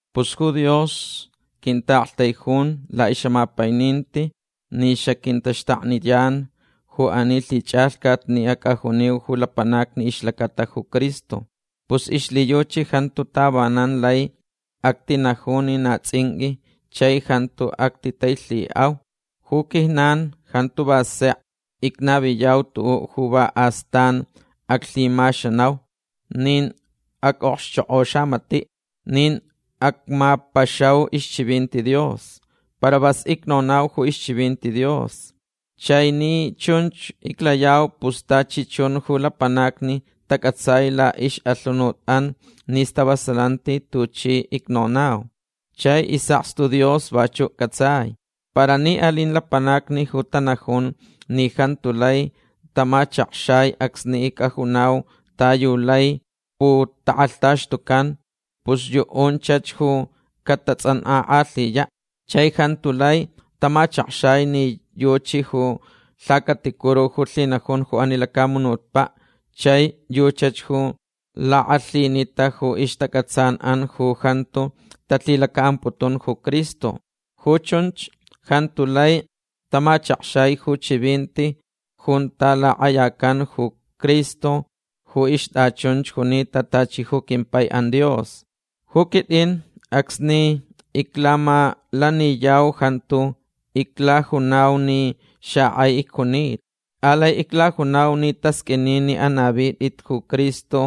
Pus ju Dios quintaʼaktaijun laʼixʼamapaininti ni xaquintaxtakniyan ju ani lhichʼalhcat ni acʼajuniu ju lapanacni ixlacata ju Cristo. Pus ixlhiyuchi jantu tavanan lai actinaju ni na tsʼinqʼui chai jantu actitailhiʼau. Ju quijnan jantu va sek icnaviyau tuʼuʼ ju va astan aclhimaxanau. Nin acʼokxchokʼo xamatiʼ. Nin acmapaxau ixchivinti Dios. Para vas icnonau ju ixchivinti Dios. Chai ni chunch iclayau pus tachi chun ju lapanacni tacʼatsai laʼixʼalhunutʼan ni stavasalanti tuchi icnonau. Chai isʼakstu Dios vachuʼ cʼatsai. Para ni alin lapanacni ju tanajun ni jantu lai tamachakxai acsni icʼajunau ta yu lai putakʼalhtaxtucan pus yuʼunchach ju catatsʼankʼakʼalhiyaʼ. Chai jantu lai tamachakxai ni yuchi ju lhacaticuru ju lhinajun ju ani lacamunutpaʼ chai yuchach ju lakʼalhinita ju ixtacʼatsanʼan ju jantu talhilacaʼamputun ju Cristo. Ju chunch jantu lai tamachakxai ju chivinti junta lakʼayacan ju Cristo ju ixtʼachunch junita tachi ju quimpaiʼan Dios. Ju quitʼin acsni iclamalaniyau jantu iclajunau ni xakʼai icjuntau. Alai iclajunau ni tasqʼuini ni anavitʼit ju Cristo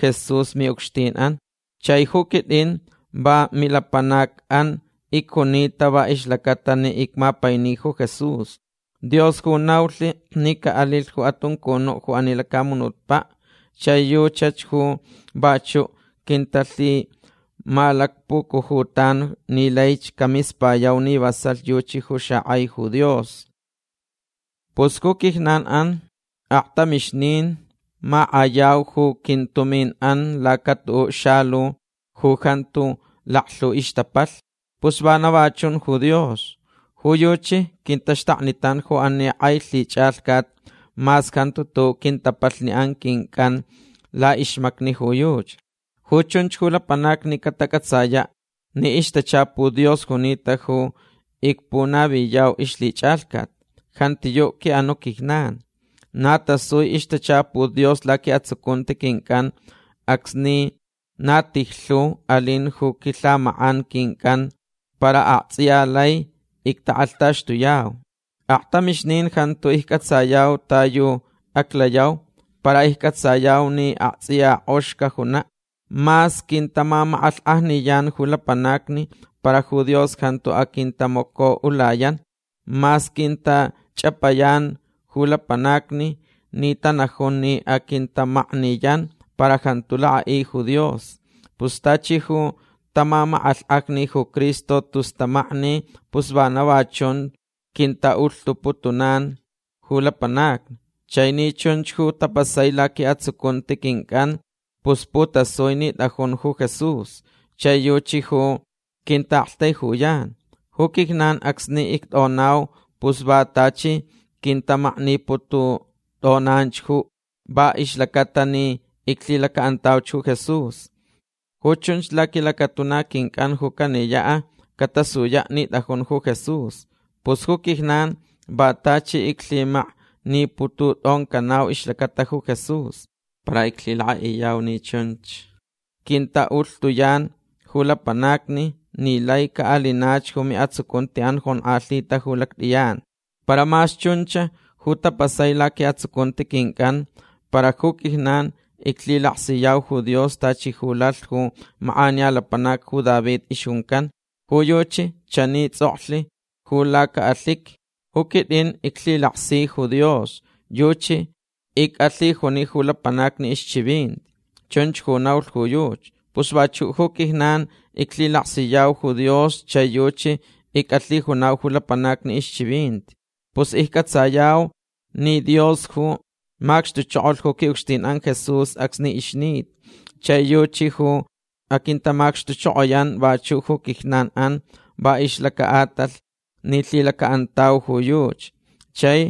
Jesús miʼucxtinʼan. Chai ju quitʼin va milapanacʼan icjunita va ixlacata ni icmapaini ju Jesús. Dios ju naulh ni caʼalilh ju atuncunuʼ ju ani lacamunutpaʼ. Chai yuchach ju vachuʼ quintalhimalacpucujutan ni laich camispayau ni vasalh yuchi ju xakʼai ju Dios. Pus ju quijnanʼan aktamixnin makʼayau ju quintuminʼan laca tuʼuʼ xalu ju jantu laklhu ixtapalh. Pus vana va chun ju Dios. Ju yuchi quintaxtaknitan ju ani kʼai lhichʼalhcat mas jantu tuʼuʼ quintapalhni quincʼan laʼixmacni ju yuchi. Ju chunch ju lapanacni catacʼatsayaʼ ni ixtachaput Dios junita ju icpunaviyau ixlhichʼalhcat. Jantiyuʼ quiʼanuʼ quijnan. Na tasui ixtachaput Dios laquiʼatsucunti quincʼan acsni na tijlhu alin ju quilhamakʼan quincʼan para aktsʼiya lai ictakʼalhtaxtuyau. Aktamixnin jantu iccʼatsayau ta yu aclayau para iccʼatsayau ni aktsʼiya kʼox cajunaʼ. Mas quintamamakʼalhkʼajniyan ju lapanacni para ju Dios jantu aquintamacoʼulayan. Mas quintachʼapayan ju lapanacni ni tanajun ni aquintamakniyan para jantu lakʼaʼi ju Dios. Pus tachi ju tamamakʼalhkʼajni ju Cristo tus tamakni pus vana va chunch quintaʼulhtuputunan ju lapanacni. Chai ni chunch ju tapasai laquiʼatsucunti quincʼan pus putasui ni tʼajun ju Jesús. Chai yuchi ju quintaʼaktaijuyan. Ju quijnan acsni ictʼonau pus va tachi quintamaknipututʼonanch va ixlacata ni iclhilacaʼantauch ju Jesús. Ju chunch laquilacatuna quincʼan ju caniyaʼ catasuyaʼ ni tʼajun ju Jesús. Pus ju quijnan va tachi iclhimaknipututʼoncanau ixlacata ju Jesús. Para iclhilakʼaʼiyau ni chunch quintaʼulhtuyan ju lapanacni ni lai caʼalinach ju miʼatsucuntiʼan jonkʼalhita ju lactʼiyan. Para mas chunch ju tapasai laquiʼatsucunti quincʼan para ju quijnan iclhilaksiyau ju Dios tachi ju lalh ju makʼaniya lapanac ju David ixjuncan. Ju yuchi chani tsʼoklh ju lacaʼalhiqui: “Ju quitʼin iclhilaksich ju Dios. Yuchi icʼalhijuni ju lapanacni ixchivinti”. Chunch ju naulh ju yuchi. Pus vachuʼ ju quijnan iclhilaksiyau ju Dios chai yuchi icʼalhijunau ju lapanacni ixchivinti. Pus iccʼatsayau ni Dios ju macxtuchokolh ju quiʼucxtinʼan Jesús acsni ixnita. Chai yuchi ju aquintamacxtuchokoyan vachuʼ ju quijnanʼan va ixlacaʼatalh ni lhilacaʼantauch ju yuchi. Chai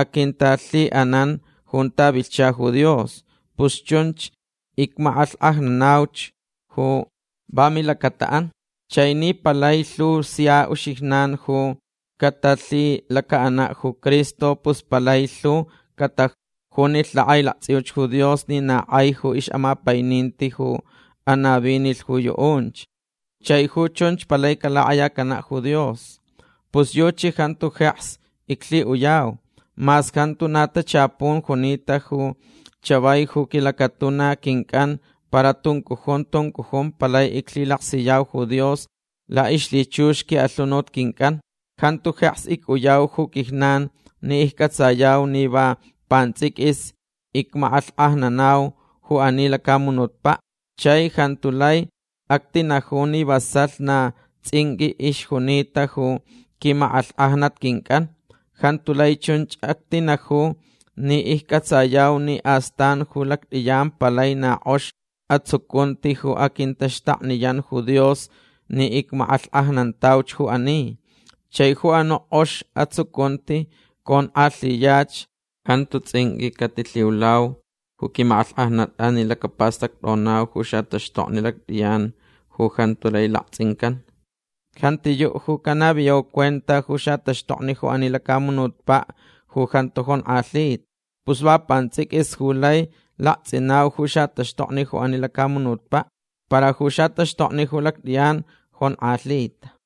aquintalhiʼanan junta vilhcha ju Dios. Pus chunch icmakʼalhkʼajnanauch ju va milacataʼan. Chai ni palai lhu sia uxijnan ju catalhilacaʼanaʼ ju Cristo pus palai lhu catajunilh lakʼailaktsʼiuch ju Dios ni na kʼai ju ixʼamapaininti ju anavinilh ju yuʼunch. Chai ju chunch palai calakʼayacanaʼ ju Dios. Pus yuchi jantu jeks iclhiʼuyau. Mas jantu na tachapun junita ju chavai ju quilacatuna quincʼan para tuncujun tuncujun palai iclhilaksiyau ju Dios laʼixlhichux quiʼalhunut quincʼan. Jantu jeks icʼuyau ju quijnan ni iccʼatsayau ni va pantsʼiquis icmakʼalhkʼajnanau ju ani lacamunutpaʼ. Chai jantu lai actinaju ni vasalh na tsʼinqʼui ixjunita ju quimakʼalhkʼajnat quincʼan. Jantu lai chunch actinaju ni iccʼatsayau ni astan ju lactʼiyan palai na kʼox atsucunti ju aquintaxtakniyan ju Dios ni icmakʼalhkʼajnantauch ju ani. Chai ju anuʼ kʼox atsucunti conkʼalhiyach. Jantu tsʼinqʼui catilhiulau ju quimakʼalhkʼajnatʼan ni lacapastactʼonau ju xataxtokni lactʼiyan ju jantu lai laktsʼincan. Jantiyuʼ ju canaviyau cuenta ju xataxtokni ju ani lacamunutpaʼ ju jantu jonkʼalhita. Pus va pantsʼiquis ju lai laktsʼinau ju xataxtokni ju ani lacamunutpaʼ. Para ju xataxtokni ju lactʼiyan jonkʼalhita.